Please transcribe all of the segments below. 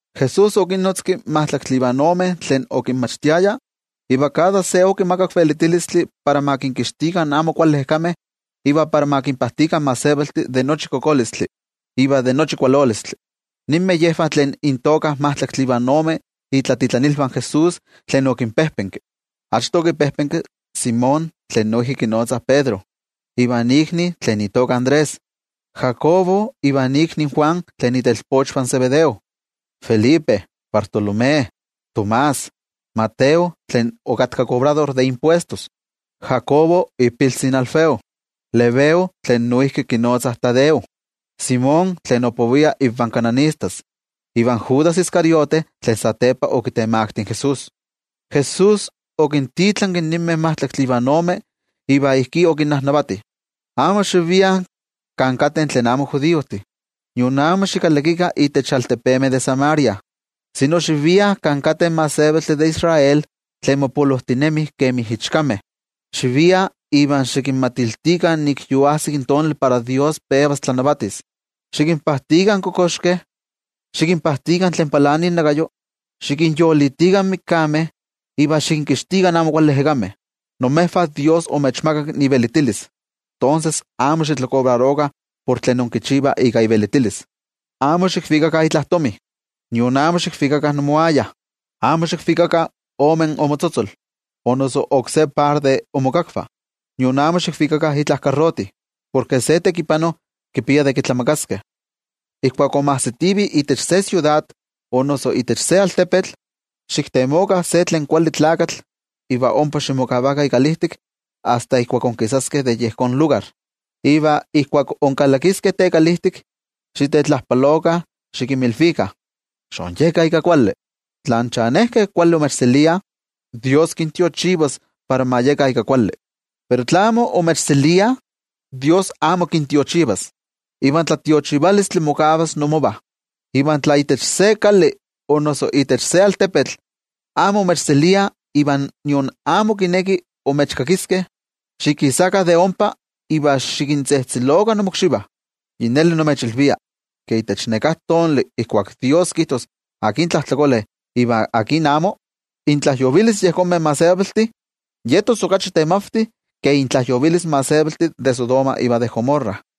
Jesús okinnotzki majtlaktli ivan ome tlen okinmachtiaya iva kada se okimakak velitilistli para ma kinkixtikah amo kuali ejekameh iva para ma kinpajtikah in gentejtih de nochi kokolistli iva de nochi kualolistli. Yen nin intoka in majtlaktli ivan ome tlatitlaniltih de Jesús tlen okinpejpenki. Achto okipejpenki Simón, tlen noijki kinotzah Pedro, ivan ikni tlen itoka Andrés, Jacobo ivan ikni Juan, tlen itelpochvah in Zebedeo, Felipe, Bartolomé, Tomás, Mateo tlen okatka kobrador de impuestos, Jacobo ipiltzi in Alfeo, Lebeo tlen noijki kinotzah Tadeo, Simón tlen opovia invan kananistas, iva Judas Iscariote tlen satepa okitemakti in Jesús. Jesús okintitlanki ninmeh majtlaktli ivan ome, iva ijkí okinnajnavati: —Amo xiviah kan kateh tlen amo judiojtih, nion amo xikalakikah itech altepemeh de Samaria, sino xiviah kan kateh in gentejtih de Israel tlen mopolojtinemih kemi ichkameh. Xiviah, iva xikinmatiltikah nik yoajsik tonali para Dios pevas tlanavatis. Xikinpajtikah in kokoxkeh, xikinpajtikah tlen palani innakayo, xikinyolitikah in mikameh iva xikinkixtikah amo kuali ejekameh. Imejvah Dios omechmakak ivelitilis, tonses amo xitlakobrarokah por tlen inkichivah ika ivelitilis. ’Amo xikvikakah itla tomi, nion amo xikvikakah imoaya. Amo xikvikakah ome imotzotzol o noso oksé par de imokakvah, nion amo xikvikakah itla karroti. Porke se tekipano kipia de kitlamakaskeh. ’Ijkuak inmajsitivih itech se siudad o noso itech se altepetl, xiktemokah se tlen kuali tlakatl iva ompa ximokavakah ikalijtik asta ijkuak inkisaskeh de yejón lugar. Iva ijkuak inkalakiskeh tekalijtik, xitetlajpalokah xikinmilvikah: “Xonyekah ika kuali.” Tla in chanejkeh kuali imechseliah, Dios kintiochivas para ma yekah ika kuali. Pero tla amo imechseliah, Dios amo kintiochivas, iva in tlatiochivalistli mokavas imovah. Iva tla itech se kali o noso itech se altepetl amo imechseliah iva nion amo kinekih imechkakiskeh, xikisakah de ompa iva xikintzejtzelokah imokxivah. Yi neli nimechilvia, ke itech neká tonali ijkuak Dios kijtos akin tlajtlakole iva akin amo, intlajyovilis yejonmeh gentejtih yetos okachi temavti ke intlajyovilis in gentejtih de Sodoma iva de Gomorra.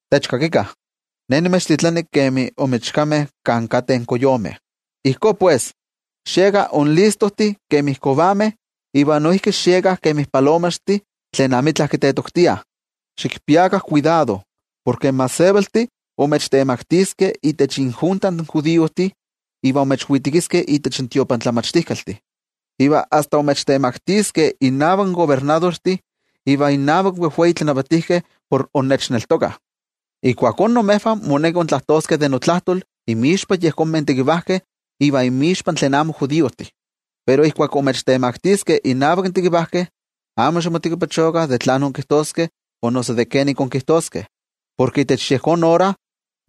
’¡Techkakikah! Ne nimechtitlani kemi inmichkameh kan kateh koyomeh. Ijkó pues, xiekah inlistojtih kemi kovameh iva noijki xiekah kemi palomaxtih tlen amitla kitetoktiah. Xikpiakah kuidado, porke in gentejtih imechtemaktiskeh itech injunta in judiojtih iva imechwitekiskeh itech tiotlamachtijkaltih. Iva asta imechtemaktiskeh innavak kobernadortih iva innavak in wejwei tlanavatijkeh por innechneltokah. Ijkuakó imejvah moneki intlajtoskeh de notlajtol inmixpa yejonmeh tekivajkeh, iva inmixpa tlen amo judiojtih. Pero ijkuak imechtemaktiskeh innavak tekivajkeh, amo ximotekipachokah de tlán inkijtoskeh o noso de kenomi inkijtoskeh. Porke itech yejón ora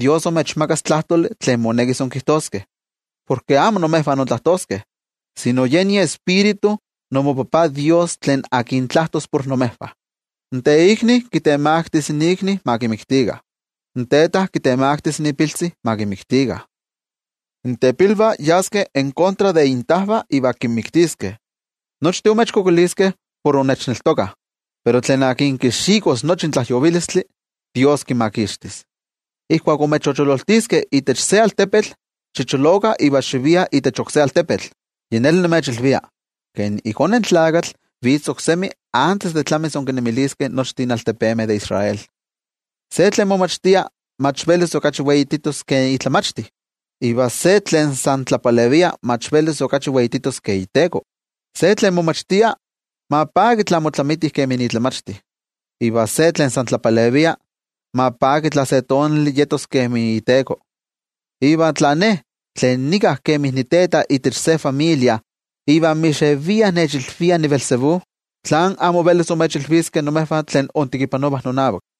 Dios imechmakas tlajtoli tlen monekis inkijtoskeh. Porke amo imejvah intlajtoskeh, sino yen iTioijyotzi imoTajtzin Dios tlen tlajtos por imejvah. ’In teikni kitemaktis ikni ma kimiktikah. In teta kitemaktis ipiltzi ma kimiktikah. In tepilvah yaskeh en kontra de intajvah iva kinmiktiskeh. Nochtin imechkualankaitaskeh por innechneltokah, pero tlen kixikos nochi in tlajyovilistli, Dios kimakixtis. Ijkuak imechochololtiskeh itech se altepetl, xicholokah iva xiviah itech oksé altepetl. Yi neli nimechilvia, ke iKone in Tlakatl vitz oksemi antes de tlamis inkinnemiliskeh nochtin altepemeh de Israel. ’Se tlen momachtia mach velis okachi weititos ke itlamachti, iva se tlen san tlapalevia mach velis okachi weititos ke iteko. Se tlen momachtia ma paki tla motlamiti kemi itlamachti, iva se tlen san tlapalevia ma paki tla se tonali yetos kemi iteko. Iva tla Ne, tlen nika kemi niteta itech se familia iva mixeviah nechilviah niBeelzebú, ¿tlán amo velis imechilviskeh imejvah tlen intekipanovah nonavak?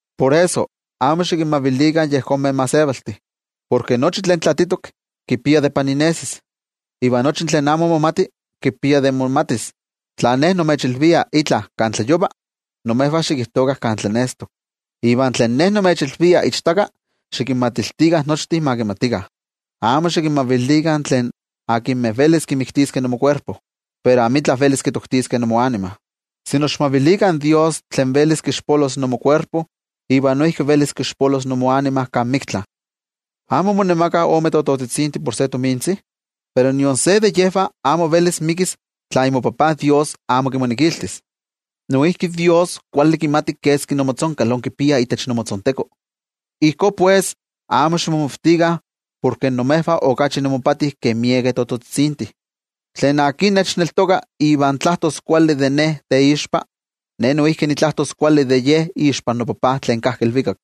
’Por eso, amo xikinmavilikah yejonmeh gentejtih. Porke nochi tlen tlaatitok kipia de paninesis, iva nochi tlen amo momati kipia de momatis. Tla Ne nimechilvia itla kan tlayova, imejvah xikijtokah kan tlanestok. Iva tlen Ne nimechilvia ichtaka, xikinmatiltikah nochtin ma kimatikah. Amo xikinmavilikah tlen velis kimiktiskeh imokuerpo, pero amitla velis kitoktiskeh imoanima. Okachi kuali xikmavilikah in Dios tlen velis kixpolos imokuerpo iva noijki velis kixpolos imoanima kan miktla. ’¿Amo monemakah ome tototzitzintih por se tomintzi? Pero nion se de yejvah amo velis mikis tla imoTajtzi Dios amo kimonekiltis. Noijki Dios kuali kimati keski imotzonkal inkipiah itech imotzontekoh. Ijkó pues, amo ximomavtikah, porke imejvah okachi imopati ke miekeh tototzitzintih. Tlen nechneltoka iva tlajtos kuali de Ne teixpa, Ne noijki nitlajtos kuali de ye ixpan noTajtzi tlen kajki ilvikak.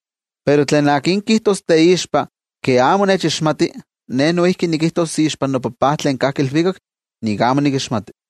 Pero tlen kijtos teixpa ke amo nechixmati, Ne noijki nikijtos ixpan noTajtzi tlen kajki ilvikak nik amo nikixmati.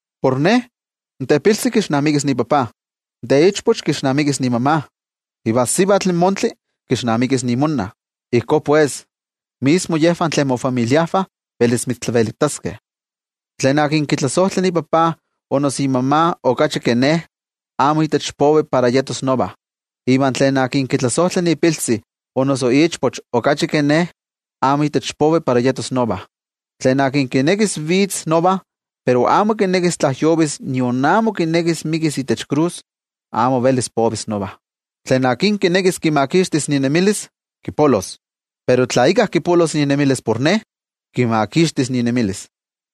Por Ne, in tepiltzi kixnamikis ipapa, in teichpoch kixnamikis imama, iva in sivatl montli kixnamikis imonna. Ijkó pues, mismo yejvah tlen imofamiliajvah velis imechtlavelitaskeh. ’Tlen kitlasojtla ipapa o noso imama okachi ke Ne, amo itech povi para yetos nova. Iva tlen kitlasojtla ipiltzi o noso ichpoch okachi ke Ne, amo itech povi para yetos nova. Tlen kinekis vitz nova pero amo kinekis tlajyovis nion amo kinekis mikis itech krus, amo velis povis nova. Tlen kinekis kimakixtis inemilis, kipolos, pero tla íkka kipolos inemilis por Ne, kimakixtis inemilis.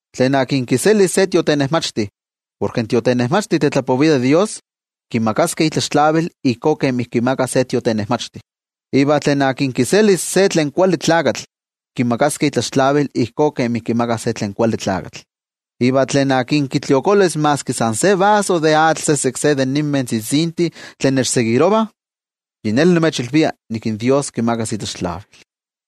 Tlen kiselis se tiotenejmachti porke in tiotenejmachti tetlapovia de Dios, kimakaskeh itlaxtlavil ijkó kemi kimakah se tiotenejmachti. Iva tlen kiselis se tlen kuali tlakatl, kimakaskeh itlaxtlavil ijkó kemi kimakah se tlen kuali tlakatl. Iva tlen kitliokolis maski san se vaso de atl sesek se de ninmeh tzitzintih tlen nechtokah, yi neli nimechilvia nik in Dios kimakas itlaxtlavil.